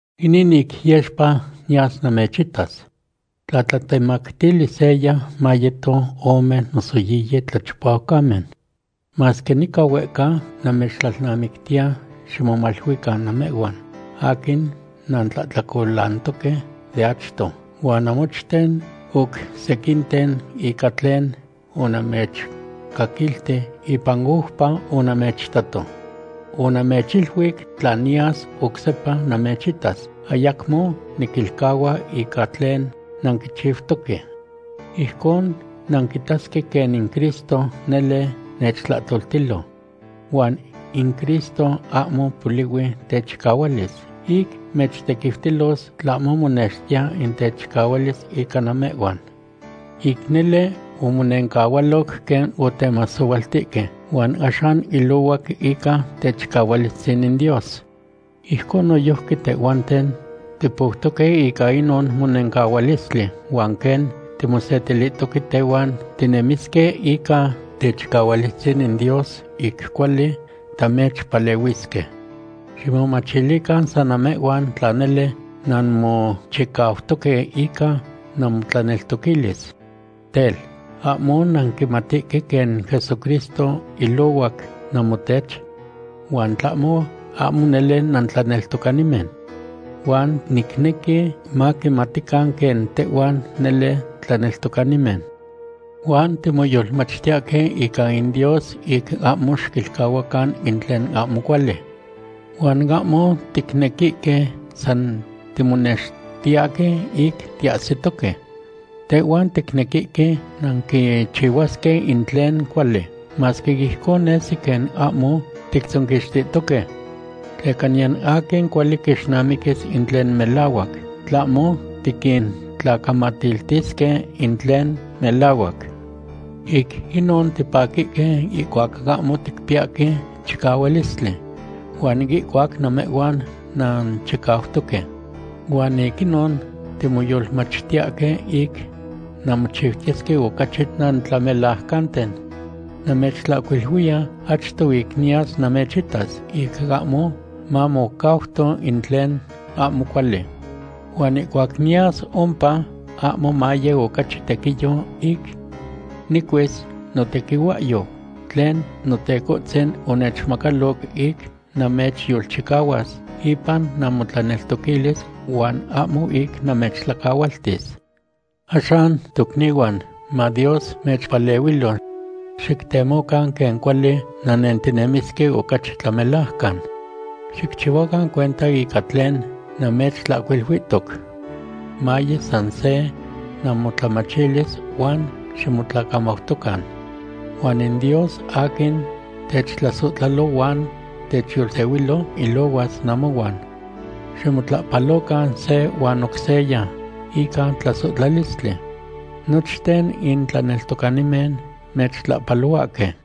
Inin ic yexpa niyas namechitas. Tla tlatemactili seya, mayeto ome noso yiyi tlachipaucamen. Masque nica huehca, namechtlalnamictiya ximomaluican namehhuan aquin nantlahtlacolantoque de achto, huan namochten oc sequinten ica tlen onamechcaquilti ipan oupa onamechitato. Onamechiluic tla niyas oc sepa namechitas, ayacmo niquilcahua ica tlen nanquichiutoque. Ijcon nanquitasque quen in Cristo nele nechtlahtoltilo. Huan in Cristo ahmo polihui techicahualis ic mechtequiutilos, tlahmo monextiya in techicahualis ica namehhuan. Ic nele omonencahualoc quen otemasohualtihque, huan axan ilohuac ica techicahualistzin in Dios. Ijcon noyojqui tehhuanten tipoutoque ica inon monencahualistli, huan quen timosetilihtoque tehuan, tinemisque ica techicahualistzin in Dios ic cuali tamechpalehuisque. Ximomachilican san namehhuan tla nele nanmochicautoque ica namotlaneltoquilis. Tel, ¿ahmo nanquimatihque quen Jesucristo ilohuac namotech? Huan tlahmo, ahmo nele nantlaneltocanimen. Huan nicnequi maquimatican quen tehhuan nele tlaneltocanimen. Huan timoyolmachtiyahque ica in Dios ic ahmo xicchihuacan in tlen ahmo cuali. Huan ahmo ticnequihque san timonextiyahque ic tiahsitoque. Tehhuan ticnequihque nanquichihuasque in tlen cuali, masque ijcon nesi quen ahmo tictzonquixtihtoque. Tleca niyan aquin cuali quixnamiquis in tlen melahuac, tlahmo tiquintlacamatiltisque in tlen melahuac. Ic inon tipaquihque ihcuac ahmo ticpiyahque chicahualistli huan ihcuac namehhuan nanchicautoque. Huan ic inon timoyolmachtiyahque ic nanmochiutiyesque ocachi nantlamelajcanten. Namechtlahcuiluiya achto ic niyas namechitas ic ahmo mamocauto in tlen ahmo cuali. Huan ihcuac niyas ompa ahmo maye ocachi tequiyo ic nicuis notequihuahyou tlen Notecohtzin onechmacaloc ic namechyolchicahuas ipan namotlaneltoquilis huan ahmo ic namechtlacahualtis. Axan tocnihuan, ma Dios mechpalehuilo. Xictemocan quen cuali nannentinemisque ocachi tlamelajcan. Xicchihuacan cuenta ica tlen namechtlatlautihtoc. Maye san se namotlamachilis huan ximotlacamautocan. Huan in Dios aquin techtlasohtlalo huan techyolsehuilo ilohuas namohuan. Ximotlahpalocan se huan oc seya ica tlasohtlalistli. Nochten in tlaneltocanimen mechtlahpalohuahque.